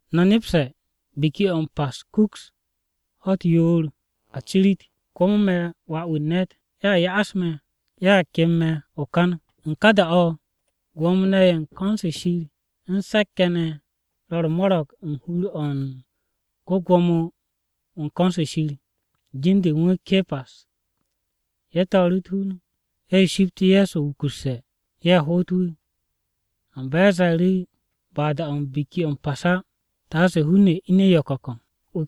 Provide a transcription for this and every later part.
“No̱ nepse̱ Biki-o̱ m-Pas kuks ho̱-u̱t yoor a cirit, komo me̱ Wà-wu̱ u̱n ne̱t ye̱a ya'as me̱ ye̱a kem me̱ o-kan.” U̱n ká da-o̱, Gwo̱mo-ne̱ ye̱ u̱n ko̱n-se Shir u̱n se̱k-ye̱ ne̱ ro̱ u̱r-mo̱ro̱g u̱n hur-o̱ u̱n ko-Gwo̱mo-wu̱ u̱n ko̱n-se Shir, jin-de u̱n wu̱ Ke̱pas. Ye̱ to̱o̱ru̱ u̱t-hun, ye̱ shipt Ye̱so wukusse̱, ye̱ hoot wu̱. Amba ye̱ ze̱e̱ru̱, “Ba da-o̱ u̱n Biki-o̱ m-Pas á, taase hun-ne̱ ine̱ yo̱ko̱ko̱.”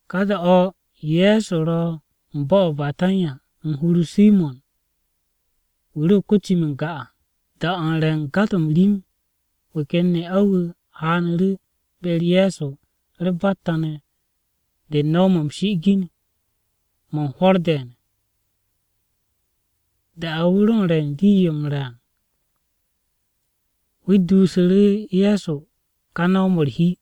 Ka da-o̱ Ye̱so ro u̱n bo̱-o̱ o-Betanya u̱n hur-o Simo̱n, wu̱ ro ko-cim n-ga à. Da-o̱ u̱n re̱ u̱n ga-to̱ m-rim, wu̱ ken ne'a-wu̱ haanu̱ru̱ be-u̱r Ye̱so u̱r-batta ne̱ de u̱n no̱w-mo̱ m-shi'igin mo̱ u̱n hwo̱r de̱e̱n. Da-o̱ wu̱ ro u̱n re̱ u̱n rii-yo m-re̱ à, wu̱ duusu̱ru̱ Ye̱so ká no̱w-mo̱ u̱r-hi.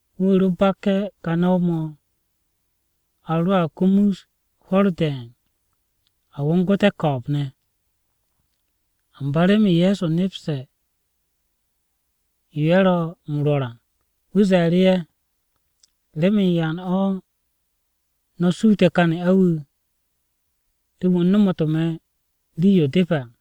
Wu̱ ro bakke̱ kà no̱w-mo̱ a roa kumus hwo̱r de̱e̱n, a wongu̱te̱ ko̱o̱b-ne̱.” Amba remen Ye̱so nepste̱ yo ye̱ ro̱ m-rwo̱r à, wu̱ ze̱e̱ru̱ ye̱, “¿Remen yan o̱ no̱ suute̱ kà ne'a-wu̱, remen wu̱ nomotu̱ me̱ rii-yo depe̱?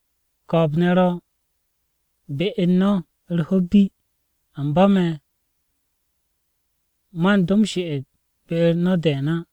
Ko̱o̱b-ne̱ ro̱ be u̱n no̱ u̱r-ho̱ bi, amba me̱, man do m-she'et be-u̱r no̱ de̱e̱n á.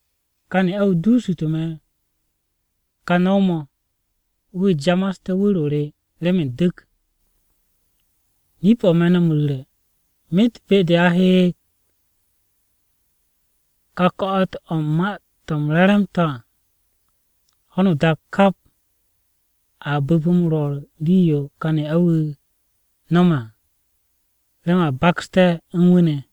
Ká ne'a-wu̱ duusu̱tu̱ me̱ ká no̱w-mo̱ wu̱ jamaste̱ wu̱r-o re remen du̱k. Nip-o̱ me̱ no̱ m-ru̱re̱, myet be-de a he ka ko̱'o̱t-o̱ u̱n Ma-to̱ m-Re̱re̱m à, ho̱no o-dak kap, a bu̱p m-rwo̱r rii-yo kà ne'a-wu̱ no̱me̱ à remen a baksté̱ u̱n wu̱ ne̱.”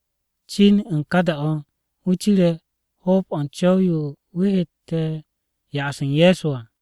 Cin u̱n ka da-o̱, wu̱ cire̱ hoob-o̱ u̱n co̱w-yo wu̱ hette̱ ya'as u̱n Ye̱so à.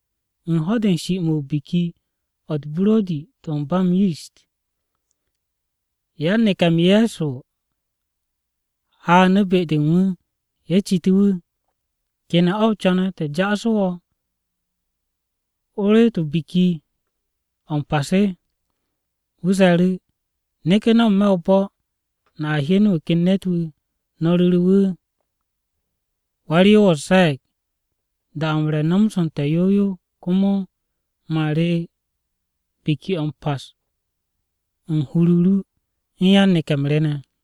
U̱n ho̱-de u̱n shi-mo̱ Biki-o̱ u̱t-Buro̱di to̱ ba m-Yist, yan-neke̱-mo̱ u̱n Ye̱so haanu̱ be-de u̱n wu̱. Ye̱ citu̱ru̱ wu̱, “¿Kene̱ o co̱ne̱ te̱ ja'asu̱ wo̱ o reet Biki-o̱ m-Pas?” Wu̱ ze̱e̱ru̱, “Neke̱ no̱ n-me̱ o-bo̱ no̱a hyen wu̱ ken ne̱t-wu̱. No̱ ru̱re̱ wu̱, ‘Wa-u̱r-Yoos ze̱e̱g, “Da-o̱ u̱n re nomoste̱ yow yow, komo man re Biki-o̱ m-Pas u̱n hur-o ru u̱n yan-neke̱-m re ne̱.”’”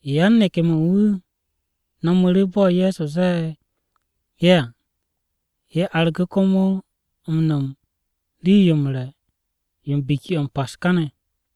Yan-neke̱-mo̱ u̱n wu̱ no̱mu̱ru̱ bo̱ Ye̱so zee ye̱ à. Ye̱ argu̱ komo m-no̱m rii-yo m-re̱ yo u̱n Biki-o̱ m-Pas káne̱.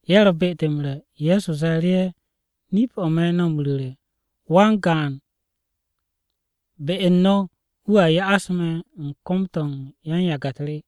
Ye̱ ro̱ be-de m-re̱ Ye̱so ze̱e̱ru̱ ye̱, “Nip-o̱ me̱ no̱ m-ru̱re̱, wan-gaan be u̱n no̱ wu̱a ya'as me̱ u̱n kom-to̱ u̱n yan-yage̱-u̱t re.”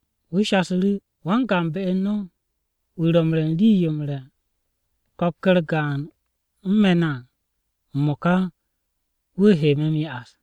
Wu̱ shasu̱ru̱, “Wan-gaan be-u̱r no̱, wu̱ ro̱ m-re̱ u̱n rii-yo m-re̱ ko̱k-u̱r gaan u̱n me̱ ne̱ à m-mo̱ka, wu̱ he me̱ m-ya'as.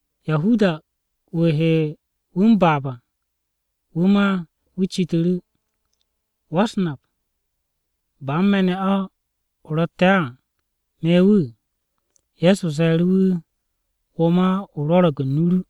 Yahudas ká wu̱ he wu̱ m-baab à, wu̱ ma wu̱ citu̱ru̱, “¿Wa-u̱s-Nap, ba u̱n me̱ ne̱ o ro̱tte̱ á, me̱ wu̱?” Ye̱so ze̱e̱ru̱ wu̱, “Wo̱ ma o rwo̱ro̱g u̱n nu-o ru.”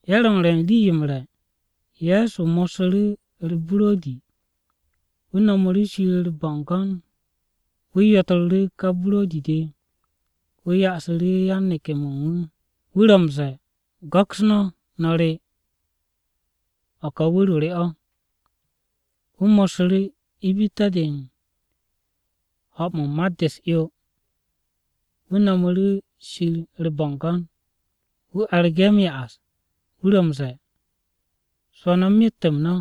Ye̱ ro u̱n re̱ u̱n rii-yo m-re̱, Ye̱so mossu̱ru̱ u̱r-buro̱di, wu̱ no̱mu̱ru̱ u̱r-bo̱ngo̱n be-de Shir. Wu̱ yotru̱ru̱ ká buro̱di-de, wu̱ ya'su̱ru̱ yan-neke̱-mo̱ u̱n wu̱. Wu̱ ro m-ze̱e̱, “Go̱ks no̱, no̱ re, o̱ ka wu̱r-o re o̱.” Wu̱ mossu̱ru̱ ibitte̱-de u̱n ho̱-mo̱ u̱n mat-de u̱s-'yo. Wu̱ no̱mu̱ru̱ Shir u̱r-bo̱ngo̱n, wu̱ argu̱ ye̱ m-ya'as. Wu̱ ro m-ze̱e̱, “Swo̱ no̱ myet-m no̱.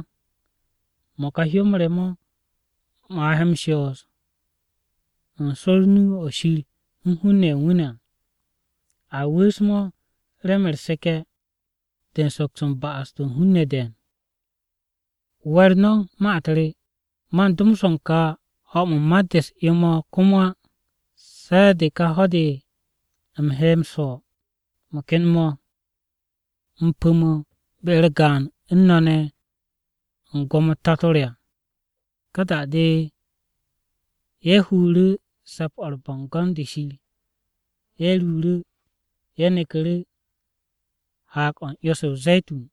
Mo̱ ka hyó-m re mo̱, mo̱ he shoos u̱n swo̱r o-nu o̱ Shir u̱n hun-ne̱ ye̱ u̱n wu̱ ne̱ à. A wu̱u̱s-mo̱ remen u̱r-seke̱ de u̱n soks u̱n ba'as-to̱ u̱n hun-ne̱ de̱e̱n. We̱r no̱ ma-u̱t re, man do swo̱ u̱n kà ho̱-mo̱ u̱n mat-de u̱s-'yo mo̱ komo á, se̱ de̱ kà ho̱-de u̱m he swo̱ u̱n mo̱ ken pu̱-mo̱ mo̱ be-u̱r gaan u̱n no̱ ne̱ u̱n gwo̱mo-u̱t Tato re à.” Ka da-de ye̱ huru̱ Se̱p-o̱ u̱r-Bo̱ngo̱n de Shir, ye̱ ruuru̱. Ye̱ neku̱ru̱ Haag-o̱ u̱n 'yo-se o-Ze̱tun.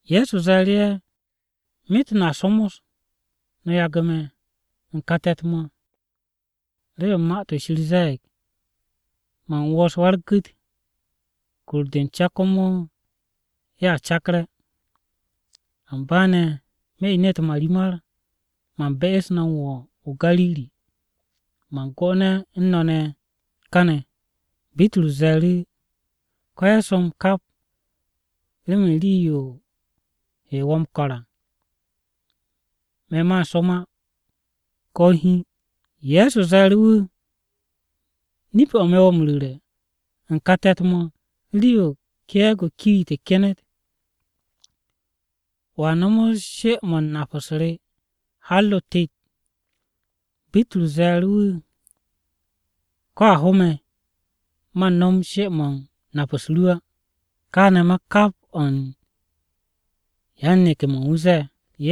Ye̱so ze̱e̱ru̱ ye̱, “Myet no̱a somos no̱ yagu̱ me̱ u̱n kà te̱t-mo̱, remen Ma-to̱ Shir ze̱e̱g, “ ‘Man wos Wa-u̱r-gu̱t, kur-de u̱n ca komo ye̱a cakre̱.’ Amba ne̱ me̱ ine̱ u̱t-marimar, man be'es no̱ m-wo̱ o-Gariri, man 'gone̱ u̱n no̱ ne̱ káne̱.” Bitrus ze̱e̱ru̱, “Ko̱ ye̱ som kap remen rii-yo he wo̱ m-ko̱r à, me̱ man som á ko̱ hiin.” Ye̱so ze̱e̱ru̱ wu̱, “Nip-o̱ me̱ wo̱ m-ru̱re̱ u̱n kà te̱t-mo̱, rii-yo ke̱e̱g-yo o-kiit kenet, wo̱a nomos she-mo̱ u̱n nap-u̱s re har o-tet.” Bitrus ze̱e̱ru̱ wu̱, “Ko̱ a ho me̱, man nom she-mo̱ u̱n nap-u̱s ru á.” Káane̱ ma kap o̱ u̱n yan-neke̱-mo̱ u̱n wu̱ ze̱e̱.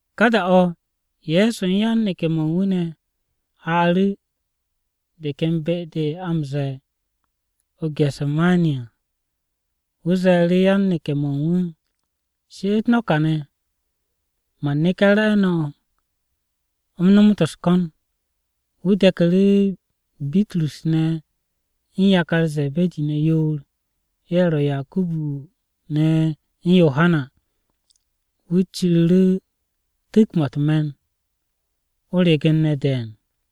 Ka da-o̱ Ye̱so u̱n yan-neke̱-mo̱ u̱n wu̱ ne̱ haaru̱ de ken be-de a m-ze̱e̱ o-Gese̱mani à. Wu̱ ze̱e̱ru̱ yan-neke̱-mo̱ u̱n wu̱, “She'et no̱ kàne̱, man neke̱ re̱e̱no̱, u̱m nomot u̱s-ko̱n.” Wu̱ de̱ku̱ru̱ Bitrus ne̱ u̱n yakar Ze̱be̱di ne̱ yoor, ye̱ ro̱ Yakubu u̱n Yohana. Wu̱ ciru̱ru̱ tu̱k-mo̱ u̱t-me̱n o-regen ne̱ de̱e̱n.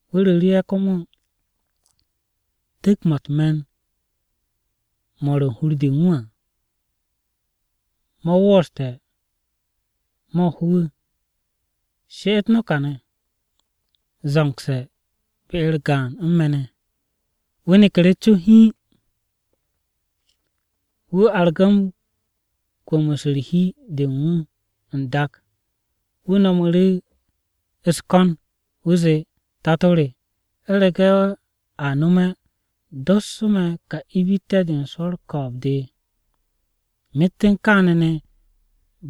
Wu̱ ru̱ru̱ ye̱ komo, “Tu̱k-mo̱ u̱t-me̱n mo̱ ro̱ u̱n hur u̱n de à, mo̱ wooste̱ mo̱ ho me̱. She'et no̱ kàne̱, zo̱ngse̱ be-u̱r gaan u̱n me̱ ne̱.” Wu̱ neku̱ru̱ co hiin, wu̱ argu̱ m-kwu̱mu̱s u̱n hi-de u̱n wu̱ n-dak. Wu̱ no̱mu̱ru̱ u̱s-ko̱n, wu̱ zee, “Tato re! U̱rege̱ a nome̱, dossu̱ me̱ kà ibitte̱-de u̱n swo̱ u̱r-ko̱o̱b de. Myet u̱n kaane̱ ne̱,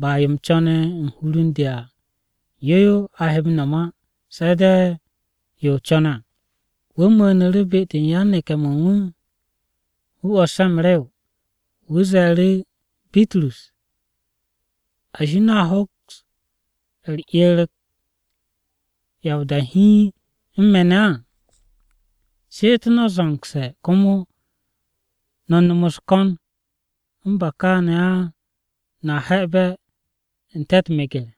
ba yo u̱m co̱ne̱ u̱n hur u̱n de à, yo yo a he m-no̱m á, se̱ de̱ yo o co̱ne̱ à.” Wu̱ mu̱u̱nu̱ru̱ be-de u̱n yan-neke̱-mo̱ u̱n wu̱, wu̱ 'wo̱s ye̱ m-rew. Wu̱ ze̱e̱ru̱ Bitrus, “Ashi! ¿No̱a hoks u̱r-'er ko̱ ya o-da hiin u̱n me̱ ne̱ á? She'et no̱ zo̱ngse̱ komo no̱ nom u̱s-ko̱n u̱n ba káane̱ á no̱a he̱'e̱be̱ n-te̱ u̱t-meger.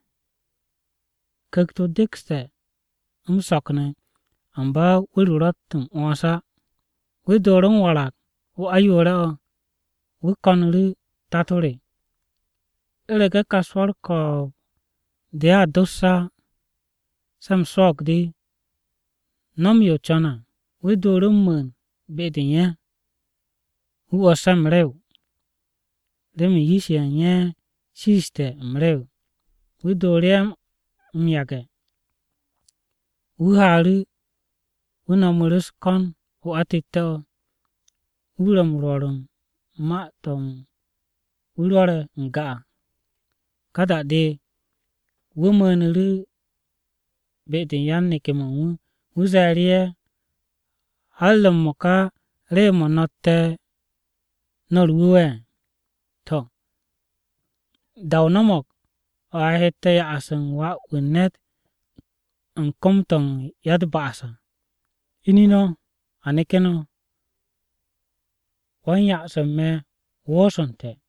Ku̱kt-o dekste̱ m-so̱k ne̱, amba wu̱r-o ro̱tt m-'wo̱ns á.” Wu̱ dooru̱ m-warag o-ayoore̱-o̱. Wu̱ ko̱nu̱ru̱, “Tato re! U̱rege̱ kà swo̱ u̱r-ko̱o̱b de a dosse̱ á se̱ u̱m swo̱o̱g de, nom yo o co̱ne̱ à.” Wu̱ dooru̱ m-mu̱u̱n be-de u̱n ye̱. Wu̱ 'wo̱s ye̱ m-rew, remen yish-ye̱ u̱n ye̱ shiiste̱ m-rew. Wu̱ dooru̱ ye̱ m-yage̱, wu̱ haaru̱. Wu̱ no̱mu̱ru̱ u̱s-ko̱n o-atette̱-o̱. Wu̱ ro̱ m-rwo̱r u̱n ma-to̱ wu̱ rwo̱re̱ n-ga à. Ka da-de, wu̱ mu̱u̱nu̱ru̱ be-de u̱n yan-neke̱-mo̱ u̱n wu̱. Wu̱ ze̱e̱ru̱ ye̱, “¿Har m-mo̱ka rew-mo̱ no̱tte̱ no̱ u̱r-wu̱we̱? To̱, da-o no̱mo̱g, o̱ a hette̱ ya'as u̱n Wà-wu̱ u̱n ne̱t u̱n kom-to̱ u̱n ya-u̱t-ba'as à. Ine̱ no̱, a neke̱ no̱. Wan-ya'as u̱n me̱ woosu̱nte̱.”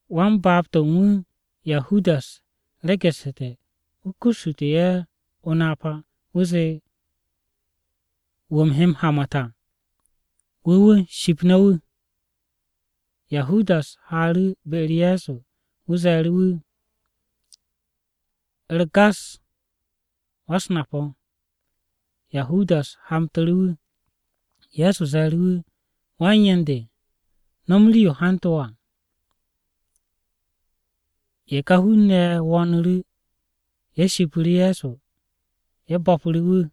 Wan-baab-to̱ u̱n wu̱, Yahudas regu̱ssu̱te̱ wu̱ kussu̱te̱ ye̱ o-napa. Wu̱ zee, “Wu̱ u̱m he m-hamat à, wu̱ wu̱ ship no̱ wu̱.” Yahudas haaru̱ be-u̱r Ye̱so, wu̱ ze̱e̱ru̱ wu̱, “U̱r-gas, wa-u̱s-Nap o̱!” Yahudas hamtu̱ru̱ wu̱. Ye̱so ze̱e̱ru̱ wu̱, “Wan-yen de, no̱m rii-yo hantu̱ wo̱ à.” Ye̱ ká hun-ne̱ ye̱ wo̱o̱nu̱ru̱, ye̱ shipu̱ru̱ Ye̱so, ye̱ bo̱pu̱ru̱ wu̱.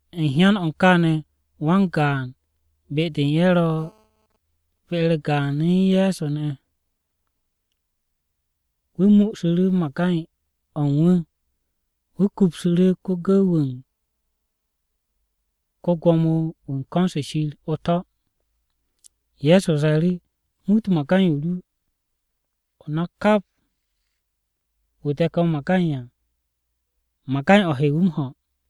U̱n hyan-o̱ u̱n káane̱, wan-gaan be-de u̱n ye̱ ro̱ be-u̱r gaan u̱n Ye̱so ne̱ à, wu̱ mu'usu̱ru̱ magay-o̱ u̱n wu̱, wu̱ kupsu̱ru̱ ko-gu̱w-wu̱ u̱n ko-Gwo̱mo-wu̱ u̱n ko̱n-se Shir o-to̱. Ye̱so ze̱e̱ru̱, “Muut magay-o ru, o nak kap wu̱ de̱ke̱ o-magay à, magay-o̱ he wu̱ m-ho.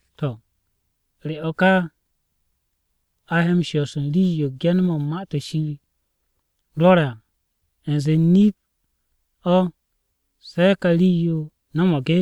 To̱, ¿re o̱ ka a he a shoos rii-yo Ge̱n-mo̱ u̱n Ma-to̱ Shir rwo̱re̱ à, u̱nze nip-o̱ se̱ ká rii-yo no̱mo̱g?”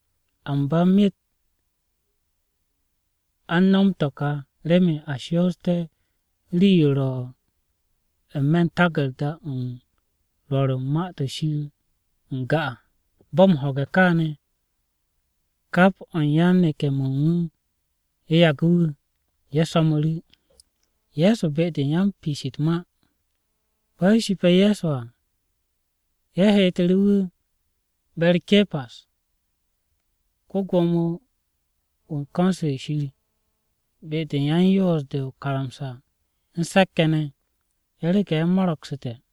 Amba myet a u̱n no̱m to̱ ka remen a shoosté̱ rii-yo ro̱ u̱n n-me̱ u̱n taku̱rda-o̱ u̱n yan-Rwo̱r u̱n Ma-to̱ Shir n-ga à.” Bo̱ m-ho̱ge̱ káane̱ kap o̱ u̱n yan-neke̱-mo̱ u̱n wu̱ ye̱ yagu̱ wu̱, ye̱ so̱mu̱ru̱. Ye̱ shipe̱ Ye̱so à, ye̱ heetu̱ru̱ wu̱ be-u̱r Ke̱pas, ko-Gwo̱mo-wu̱ u̱n ko̱n-se Shir, be-de yan-Yoos-de o-karamsa u̱n se̱k-ye̱ ne̱, ye̱ rege̱ ye̱ mo̱ro̱gsu̱te̱ à.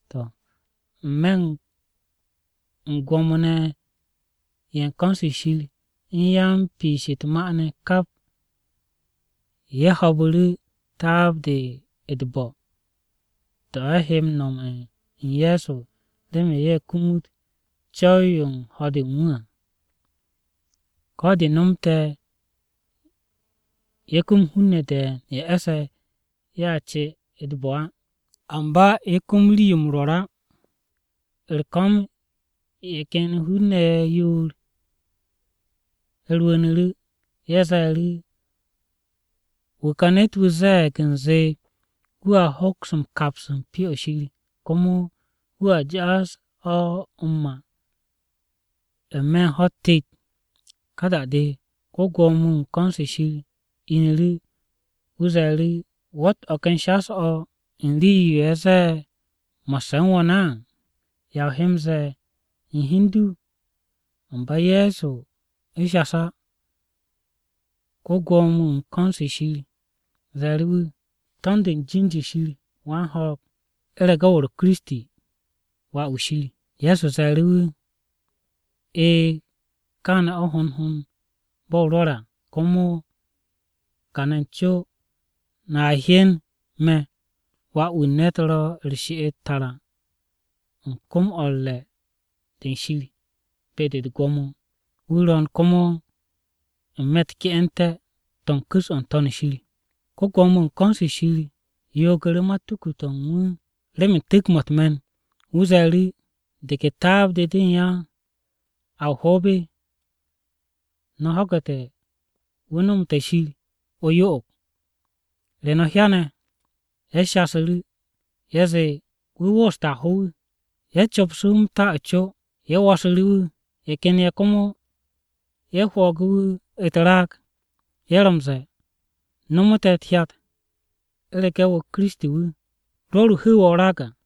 To̱, n-me̱ u̱n Gwo̱mo-ne̱ ye̱ u̱n ko̱n-se Shir u̱n Mo̱ro̱g-de u̱n Se̱k-ye̱ de ne̱, kap ye̱ ho̱o̱bu̱ru̱ taab-de u̱t-bo̱ to̱ ye̱ he nome̱ u̱n Ye̱so remen ye̱ kumut co̱w-yo u̱n ho̱-de u̱n wu̱ à. Ko̱ de̱ nomte̱ ye̱ kum hun-ne̱ de̱e̱n ye̱ e̱sse̱ ye̱a ce u̱t-bo̱ à, amba ye̱ kum rii-yo m-rwo̱r á. U̱r-ko̱m ye̱ ken hun-ne̱ yoor-ye̱ rwu̱u̱nu̱ru̱. Ye̱ ze̱e̱ru̱, “Wu̱ ka ne̱t-wu̱ ze̱e̱g u̱nze wu̱a hoks m-kaps u̱n Pyo-o̱ Shir, komo wu̱ jaas-o̱ m-ma n-me̱ u̱n ho̱-u̱t tet.” Ka da-de, ko-Gwo̱mo-wu̱ u̱n ko̱n-se Shir inu̱ru̱, wu̱ ze̱e̱ru̱, “¿Wo̱tt o̱ ken shas-o̱ u̱n rii-yo ye̱ zee mo̱sse̱ u̱n wo̱ ne̱ á? ¿Ya o he m-ze̱e̱ u̱n hi u̱n du?” Amba Ye̱so shas á. Ko-Gwo̱mo-wu̱ u̱n ko̱n-se Shir ze̱e̱ru̱ wu̱, “To̱nd u̱n jin-de Shir wan-ho̱o̱g, u̱rege̱ wo̱ ro̱ Kiristi, Wà-wu̱ Shir.” Ye̱so ze̱e̱ru̱ wu̱, “E̱e̱, káane̱ o̱ hond hond bo̱ o rwo̱re̱ à. Komo kane̱ co no̱a hyen me̱ Wà-wu̱ u̱n ne̱t ro̱ u̱r-she'et tara u̱n kom-o̱ u̱r-re̱ de u̱n Shir be-de u̱t-gwo̱mo, wu̱ ro̱o̱n komo n-me̱ u̱t-ke'ente̱ to̱ u̱n ku̱s-o̱ n-To̱n shir.” Ko-Gwo̱mo-wu̱ u̱n ko̱n-se Shir yoogu̱ru̱ matuku-to̱ u̱n wu̱ remen tu̱k-mo̱ u̱t-me̱n. Wu̱ ze̱e̱ru̱, “¿De ke taab-de de u̱n ya a o-hoob? No̱ ho̱gu̱te̱ wu̱ nomote̱ Shir o-yo'og. ¿Re no̱ hyane̱?” Ye̱ shasu̱ru̱, ye̱ zee, “Wu̱ wooste̱ a ho wu̱!” Ye̱ copsu̱ wu̱ m-ta o-co, ye̱ wosru̱ru̱ wu̱. Ye̱ ken ye̱ komo ye̱ hwo̱o̱gu̱ wu̱ u̱t-raag. Ye̱ ro̱ m-ze̱e̱, “Nomo te̱ u̱t-hyat, u̱rege̱ wo̱ Kiristi wu̱! Rwo̱r wu̱ hu̱u̱ wo̱ o-raag à!”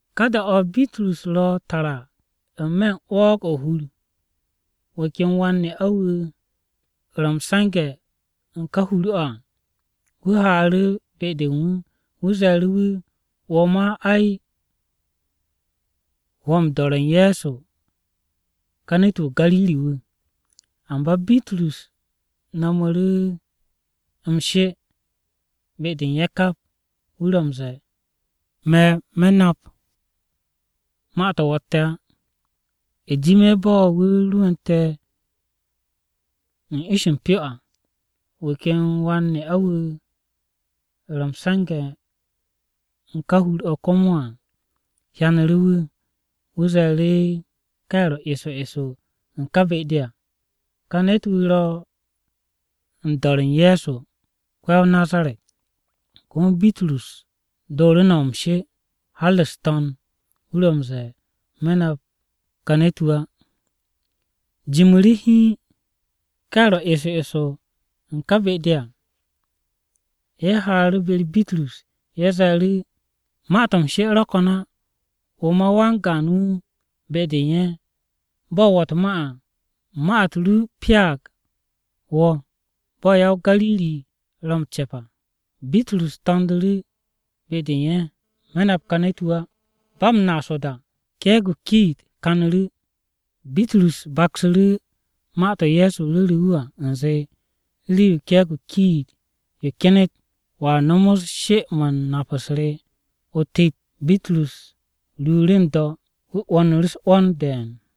Ka da-o̱, Bitrus ro̱ tara n-me̱ u̱n 'wo̱o̱g-o̱ o-hur, wu̱ ken wan-ne'a-wu̱ wu̱ ro̱ m-se̱nge̱ u̱n ká hur-o̱ à, wu̱ haaru̱ be-de u̱n wu̱, wu̱ ze̱e̱ru̱ wu̱, “Wo̱ ma, ay, wo̱ m-do̱re̱ u̱n Ye̱so kà ne̱t-wu̱ o-Gariri wu̱.” Amba Bitrus no̱mu̱ru̱ m-she be-de u̱n ye̱ kap. Wu̱ ro̱ m-ze̱e̱, “Me̱, me̱ nap ma-to̱ wo̱tte̱ á!” U̱jime̱ bo̱ wu̱ rwu̱u̱nte̱ ish-o m-pyo à, wu̱ ken wan-ne'a-wu̱ ro m-se̱nge̱ u̱n ká hur-o̱ komo à hyanu̱ru̱ wu̱. Wu̱ ze̱e̱ru̱ ka ye̱ ro eso eso u̱n ká be-de à, “Kà ne̱t-wu̱ ro̱ u̱n do̱re̱ u̱n Ye̱so ko-ya-o-Nazaret!” Komo Bitrus dooru̱ no̱m m-she, har u̱s-to̱nd. Wu̱ ro̱ m-ze̱e̱, “Me̱ nap ma ká ne̱t-wu̱ á.” Jimu̱ru̱ hiin, ka ye̱ ro eso eso u̱n ká be-de à, ye̱ haaru̱ be-u̱r Bitrus. Ye̱ ze̱e̱ru̱, “Ma-to̱ m-she ro̱ ko̱n á. Wo̱ ma wan-gaan wu̱ be-de u̱n ye̱. Bo̱ wo̱ u̱t-ma à, ma-u̱t ru pyaag wo̱ bo̱ ya-o-Gariri ro̱ m-ce̱p à.” Bitrus to̱ndu̱ru̱ be-de u̱n ye̱, “Me̱ nap ká ne̱t-wu̱ á!” Ba m-naas o-da, ke̱e̱g-yo kiit-o kanu̱ru̱. Bitrus baksu̱ru̱ ma-to̱ Ye̱so ru̱ru̱ wu̱ à u̱nze, “Rii-yo ke̱e̱g-yo kiit-yo kyenet, wo̱a nomos she-mo̱ u̱n nap-u̱s re o-tet.” Bitrus ruuru̱ n-do̱ wu̱ 'wo̱nu̱ru̱ u̱s-'wo̱n de̱e̱n.